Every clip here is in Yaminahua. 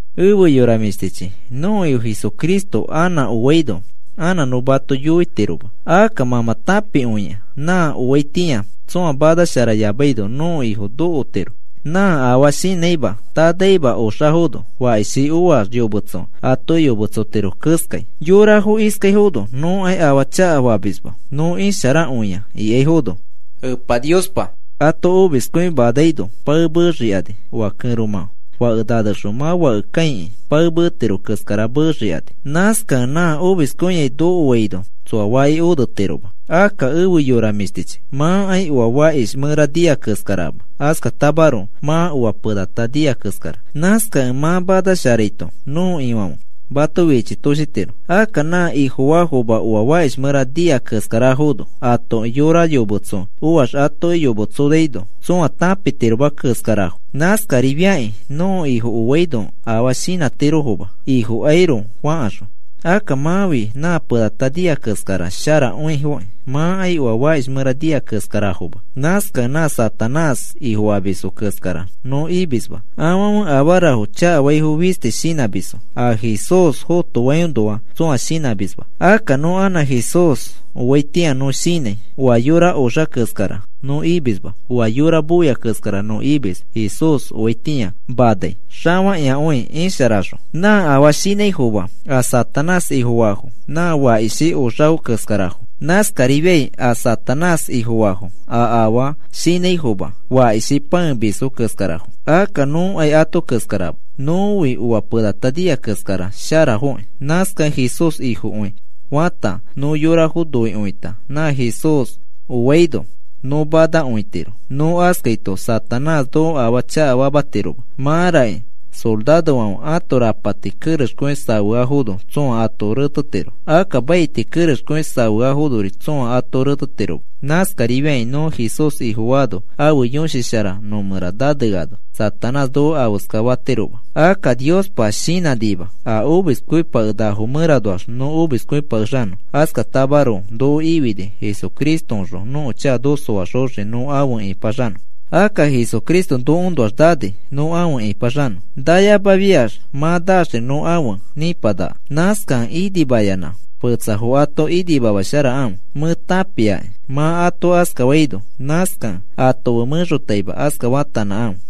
Efe yora mĩshtichi, nõko Ifo Jesucristo anã oaino anã nõ mato yoitiroma. Akka mã mã tãpikõia nã oaitĩa tsõa manasharayamaino nõko Ifo nokotiro. Nã afaa shinãima tanaima oxafono, fakishi oax yometso atoki yometsotiro keskai. Yorafo iskaifono: “Nõkai afaa chakafamisma nõ isharakõia,” ikaifono Epa Niospa ato omiskõimanaino pae meexikani. Oa kẽromã fake nanexõ mã fake kãikĩ pae meetiro keskara meexikani. Nãskakẽ nã omiskõiai nokoaino tsoa faki onetiroma. Akka efe yora mĩshtichi, mãkai oa fakish mẽra nia keskarama, askatamaroko mã oa penata nia keskara. Nãskakẽ mã manasharaito nõko Ifãfe mato fichitoshitiro. Akka nã Ifofaafoma oa fakish mẽra nia keskarafono, atoki yora yometso oax atoki yometsoaino tsõa tãpitiroma keskarafo. Nãskarifiakĩ nõko Ifo oaino afaa shinãtirofoma, Ifokairoko fakaxõ. Akka mãfi nã penata nia keskara sharakõifokĩ. Mãkai oa fakish mẽra nia keskarafoma. Nãskakẽ nã Satanás ifofamisfo keskara nõ imisma, afãfe afarafo chakafaifo fisti shinãmisfo. A Jesús fotoainoa tsõa shinãmisma. Akka nõ anã Jesús oaitĩa nõ shinãi, oa yora oxa keskara nõ imisma. Oa yora moia keskara nõ imis Jesús oaitĩa manai xafakĩakõi isharaxõ. Nã afaa shinãifoma a Satanás ifofaafo nã fakishi oxafo keskarafo. Nãskarifiai a Satanás ifofaafo a afaa shinãifoma fakishi pãemisfo keskarafo. Akka nõkai ato keskarama, nõfi oa penata nia keskara sharafoki. Nãskakẽ Jesús Ifokõi fata nõ yorafo noikõita nã Jesús oaino nõ manakõitiro, nõ askaito Satanás noko afaa chakafamatiroma. Mãraki sorarofãfe ãto rapati kerexkõi safeafono tsõa ato retetiro, ãto maiti kerexkõi safeafonori tsõa ato retetiroma. Nãskarifiakĩ nõ Jesús Ifofaano, ãfe Yõshi Shara nõ mẽra naneano Satanás noko afeska fatiroma. Akka Niospa shinãnima a omiskõipakenakafo mẽranoax nõ omiskõipakexanõ. Askatamaroko noko ifini Jesucristoõxõ nõko chaka noko soaxoxiki nõ afe ĩpaxanõ. Akka Jesucristo nokoõnoax nani nõ afe ĩpaxanõ. Nayamafiax mã naaxri nõ afe nĩpanaka. Nãskakẽ inimayanã fetsafo ato inimamasharakãfe. Mẽ tãpiaki mã ato askafaino. Nãskakẽ ato fe mẽxotaima aska faatanãkãfe.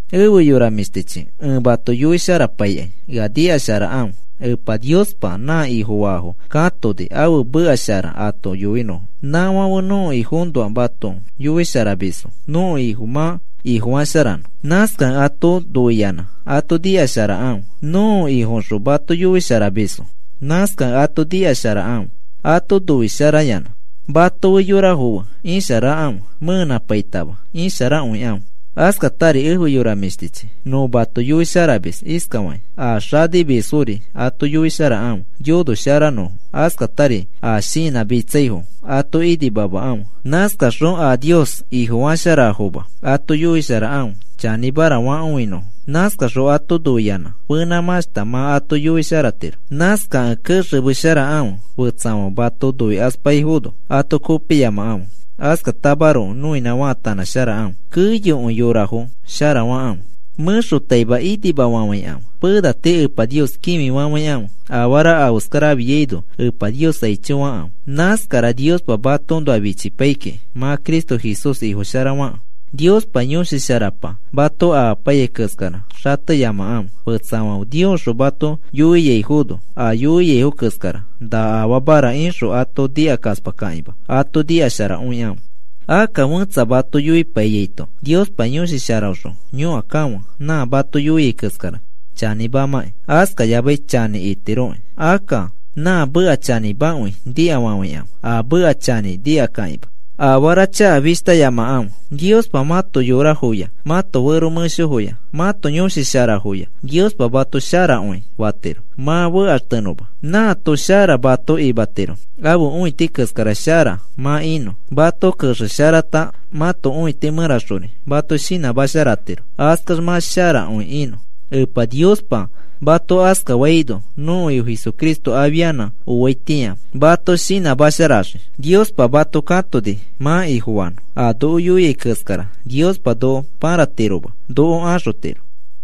Efe yora mĩshtichi, ẽ mato yoisharapaikai, ea nikasharakãfe. Epa Niospa nã Ifofaafo katoni ãfe meka shara mato yoinõfo. Nãfãfe nõko Ifoõnoa mato yoisharamisfo nõko Ifo mã Ifo sharafanõ. Nãskakẽ ato noiyanã ato nikasharakãfe. Nõko Ifoõxõ mato yoisharamisfo, nãskakẽ ato nikasharakãfe, ato noisharayanã. Mato fe yorafo fe isharakãfe, mẽenãpaitama isharakõikãfe. Askatari efe yora mĩshtichi, nõ mato yoisharamis iskafakĩ: A xanimisfori ato yoisharakãfe yonosharanõfo, askatari a shinãmitsaifo ato inimamakãfe. Nãskaxõ a Nios Ifofasharafoma ato yoisharakãfe chanĩmara fakõinõfo. Nãskaxõ ato noiyanã fenãmãshta mã ato yoisharatiro. Nãskakẽ kexemesharakãfe, fetsafãfe mato noikaspaifono ato kopiyamakãfe. Askatamaroko noinã faatanãsharakãfe, keyokõi yorafo sharafakãfe. Mẽxotaima inimafafãikãfe. Pena tii Epa Nios kĩfifafãikãfe. Afara afeskara afiaino, Epa Nios aicho fakãfe. Nãskara Niospa matoõnoa fichipai kiki mã Cristo Jesús Ifo shara fakẽ. Niospa Yõshi Sharapa mato amapaiyai keskara xateyamakãfe. Fetsafãfe Niosxõ mato yoiaifono a yoiaifo keskara, “Na afamara,” ixõ ato nikakaspakakĩma, ato nikasharakõikãfe. Akka fẽtsa mato yoipaiyaito Niospa Yõshi Sharaõxõ yõkakãfe nã mato yoiai keskara chanĩmamakĩ askayamai chanĩ itiroki. Akka nã meka chanĩmakõi nikafafãikãfe, a meka chanĩ nikakakima. Afara chaka fishtayamakãfe. Niospa mãto yorafoya, mãto fero mẽshofoya mãto yõshi sharafoya Niospa mato sharakõi fatiro mã fekaxtenõma. Nãato shara mato imatiro ãfe õiti keskara shara mã inõ. Mato kexesharata mãto õiti mẽraxori mato shinãmasharatiro. Askax mã sharakõi inõ. Epa Niospa mato askafaino nõko Ifo Jesucristo afianã oaitĩa mato shinãmasharaxii. Niospa mato katoni mã Ifofanõ. A noko yoiai keskara Niospa noko pãratiroma, noko axotiro.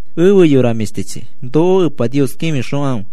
Efe yora mĩshtichi, noko Epa Nios kĩfixokãfe.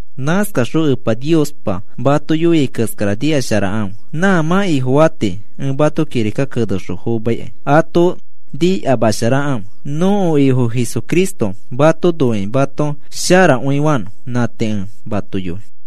Nãskaxõ Epa Niospa mato yoia keskara nikasharakãfe. Nã mã Ifofa tii ẽ mato kirika kenexõ fomaikai ato nikamasharakãfe. Nõko Ifo Jesucristo mato noikĩ mato sharakõifanõ. Nã tii ẽ mato yoi. Pablo